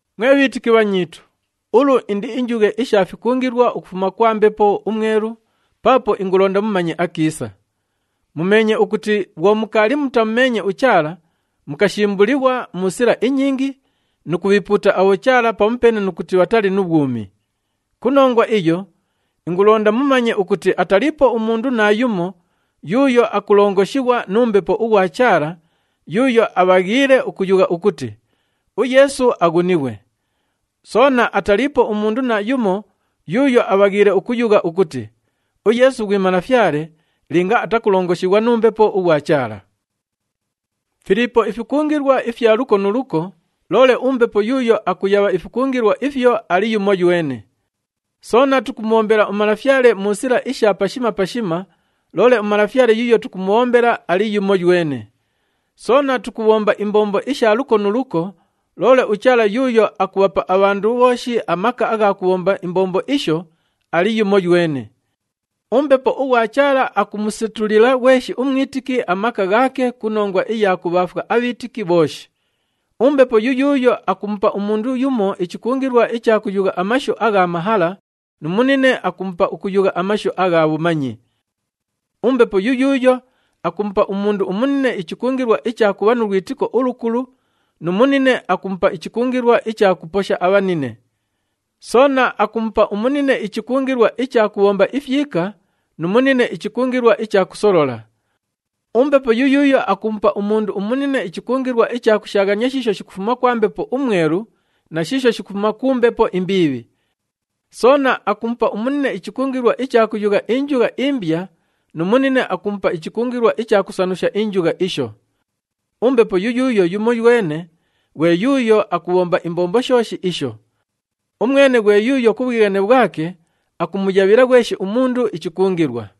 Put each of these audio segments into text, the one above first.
Mwe bhiitiki bhanyiitu, ulu indiinjughe isha fikungilwa ukufuma kwa Mbepo uMwelu paapo ingulonda mumanye akiisa. Mumeenye ukuti bhwo mukaali mutamumeenye uChaala, mukashimbulighwa mu sila inyingi nu kubhiipuuta abhochaala pamupeene nu kuti bhatali nu bhwumi. Ku nongwa iyo, ingulonda mumanye ukuti ataliipo umundu naayumo yuuyo akulongoshighwa nu Mbepo ughwa Chaala yuuyo abhaghiile ukuyugha ukuti, “UYeesu aghunighwe.” Soona ataliipo umundu naayumo yuuyo abhaghiile ukuyugha ukuti, “UYeesu ghwi Malafyale,” linga atakulongoshighwa nu Mbepo ughwa Chaala. Filiipo ifikungilwa ifya luko nu luko, loole uMbepo yuuyo akuyabha ifikungilwa ifyo ali yumoywene. Soona tukumubhombela uMalafyale mu sila isha pashima pashima, loole uMalafyale yuuyo tukumubhombela, ali yumoywene. Soona tukubhomba imbombo isha luko nu luko, loole uChaala yuuyo akubhapa abhandu bhooshi amaka agha kubhomba imbombo isho, ali yumoywene. UMbepo ughwa Chaala akumusetulila ghweshi umwitiki amaka ghaake ku nongwa iya kubhaafwa abhiitiki bhooshi. UMbepo yuyuuyo akumupa umundu yumo ichikungilwa icha kuyugha amashu agha mahala nu munine akumupa ukuyugha amashu agha bhumanyi. UMbepo yuyuuyo akumupa umundu umunine ichikungilwa icha kubha nu lwitiko ulukulu nu munine akumupa ichikungilwa icha kuposha abhabhine. Soona akumupa umunine ichikungilwa icha kubhomba ifyika nu munine ichikungilwa icha kusolola. UMbepo yuyuuyo akumupa umundu umunine ichikungilwa icha kushaaghania shiisho shikufuma kwa Mbepo uMwelu na shiisho shikufuma ku mbepo imbiibhi. Soona akumupa umunine ichikungilwa icha kuyugha injugha imbya nu munine akumupa ichikungilwa icha kusanusha injugha isho. UMbepo yuyuuyo yumoywene ghwe yuuyo akubhomba imbombo shooshi isho. Umwene ghwe yuuyo ku bhwighane bhwake akumuyabhila ghweshi umundu ichikungilwa.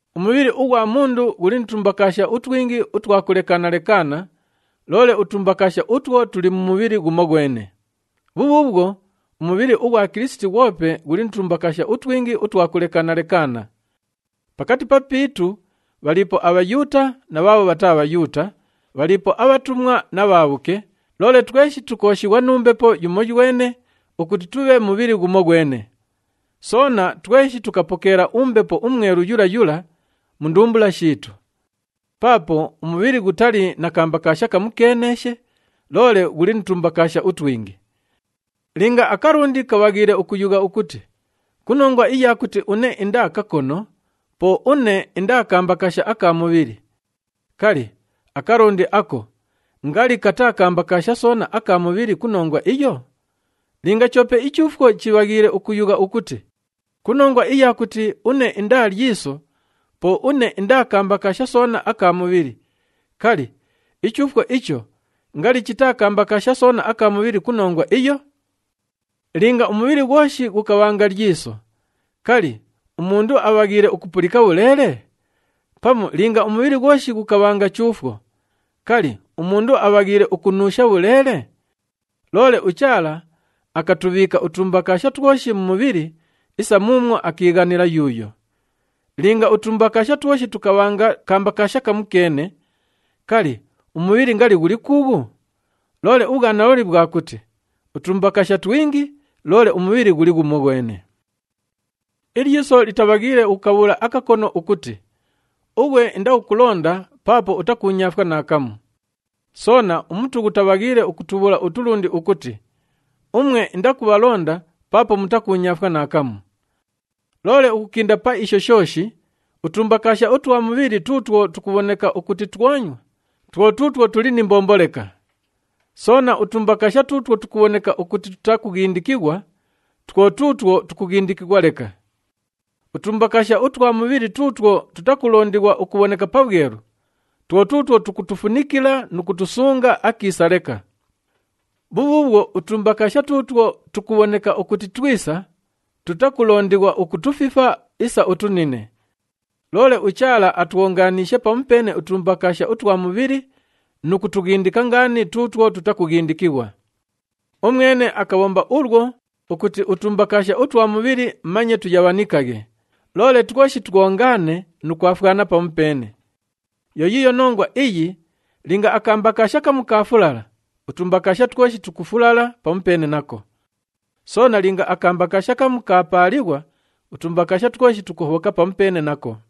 Umubhili ughwa mundu ghuli nu tumbakaasha utwingi utwa kulekaana-lekaana, loole utumbakaasha utwo tuli mu mubhili ghumoghwene. Bhubhuubhwo, umubhili ughwa Kilisiti ghwope ghuli nu tumbakaasha utwingi utwa kulekaana-lekaana. Pakati papiitu bhaliipo aBhayuuta na bhaabho bhataa Bhayuuta, bhaliipo abhatumwa na bhaabhuke, loole tweshi tukooshighwa nu Mbepo yumoywene ukuti tubhe mubhili ghumoghwene. Soona, tweshi tukapokeela uMbepo uMwelu yula yula mu ndumbula shiitu. Paapo umubhili ghutali na kambakaasha kamukeeneeshe, loole ghuli nu tumbakaasha utwingi. Linga akalundi kabhaghiile ukuyugha ukuti, “Ku nongwa iya kuti une indaa kakono, po une indaa kambakaasha aka mubhili,” kali, akalundi ako ngali kataa kambakaasha soona aka mubhili ku nongwa iyo? Linga choope ichuufwo chibhaghiile ukuyugha ukuti, “Ku nongwa iya kuti une indaa lyiso, po une indaa kambakaasha soona aka mubhili,” kali, ichuufwo icho ngali chitaa kambakaasha soona aka mubhili ku nongwa iyo? Linga umubhili ghwoshi ghukabhanga lyiso, kali, umundu abhaghiile ukupulika bhuleele? Pamu linga umubhili ghwoshi ghukabhanga chuufwo, kali, umundu abhaghiile ukunuusha bhuleele? Loole uChaala akatubhiika utumbakaasha twoshi mu mubhili isa muumwo akiighanila yuuyo. Linga utumbakaasha twoshi tukabhanga kambakaasha kamukeene, kali, umubhili ngali ghuli kuughu? Loole ubhwanalooli bhwa kuti utumbakaasha twingi, loole umubhili ghuli ghumoghwene. Ilyiso litabhaghiile ukukabhuula akakono ukuti, “Ughwe indakukulonda paapo utakuunyaafwa naakamu.” Soona, umutu ghutabhaghiile ukutubhuula utulundi ukuti, “Umwe indakubhalonda paapo mutakuunyaafwa naakamu.” Loole ukukinda pa isho shooshi, utumbakaasha utwa mubhili tuutwo tukubhoneka ukuti twonywa, two tuutwo tuli ni mbombo leka. Soona, utumbakaasha tuutwo tukubhoneka ukuti tutakughindikighwa, two tuutwo tukughindikighwa leka. Utumbakaasha utwa mubhili tuutwo tutakulondighwa ukubhoneka pabhwelu, two tuutwo tukutufunikila nu kutusunga akiisa leka. Bhubhuubhwo, utumbakaasha tuutwo tukubhoneka ukuti twisa, tutakulondighwa ukutufifa isa utunine. Loole uChaala atwonganiishe pamupeene utumbakaasha utwa mubhili nu kutughindika ngaani tuutwo tutakughindikighwa. Umwene akabhomba ulwo ukuti utumbakaasha utwa mubhili manye tuyabhanikaghe, loole twoshi twongaane nu kwafwana pamupeene. Yo yiiyo nongwa iyi linga akambakaasha kamu kaafulala, utumbakaasha twoshi tukufulala pamupeene nako. Soona linga akambakaasha kamu kaapaalighwa, utumbakaasha twoshi tukuhobhoka pamupeene nako.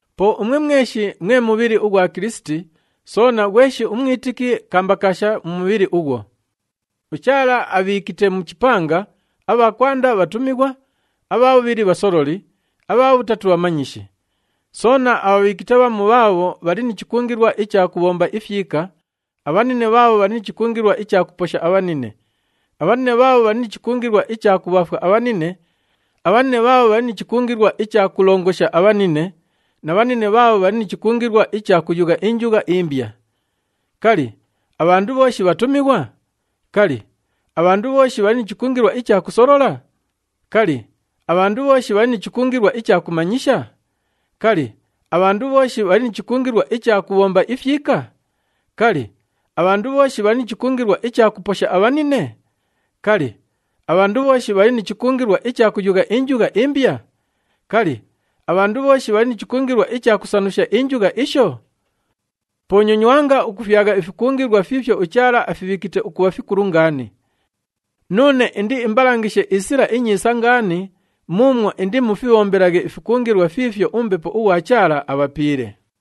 Po umwe mweshi mwe mubhili ughwa Kilisiti, soona ghweshi umwitiki kambakaasha mu mubhili ughwo. UChaala abhiikite mu chipanga, abha kwanda bhatumighwa, abha bhubhili bhasololi, abha bhutatu bhamanyishi. Soona abhabhiikite bhamu bhaabho bhali ni chikungilwa icha kubhomba ifyika, abhanine bhaabho bhali ni chikungilwa icha kuposha abhabhine, abhanine bhaabho bhali ni chikungilwa icha kubhaafwa abhanine, abhanine bhaabho bhali ni chikungilwa icha kulongosha abhanine na bhanine bhaabho bhali ni chikungilwa icha kuyugha injugha imbya. Kali, abhandu bhooshi bhatumighwa? Kali, abhandu bhooshi bhali ni chikungilwa icha kusolola? Kali, abhandu bhooshi bhali ni chikungilwa icha kumanyisha? Kali, abhandu bhooshi bhali ni chikungilwa icha kubhomba ifyika? Kali, abhandu bhooshi bhali ni chikungilwa icha kuposha abhabhine? Kali, abhandu bhooshi bhali ni chikungilwa icha kuyugha injugha imbya? Kali, abhandu bhooshi bhali ni chikungilwa icha kusanusha injugha isho? Po nyonywanga ukufyagha ifikungilwa fiifyo uChaala afibhiikite ukubha fikulu ngaani. Nuune indiimbalangishe isila inyiisa ngaani muumwo indimufibhombelaghe ifikungilwa fiifyo uMbepo ughwa Chaala abhapiile.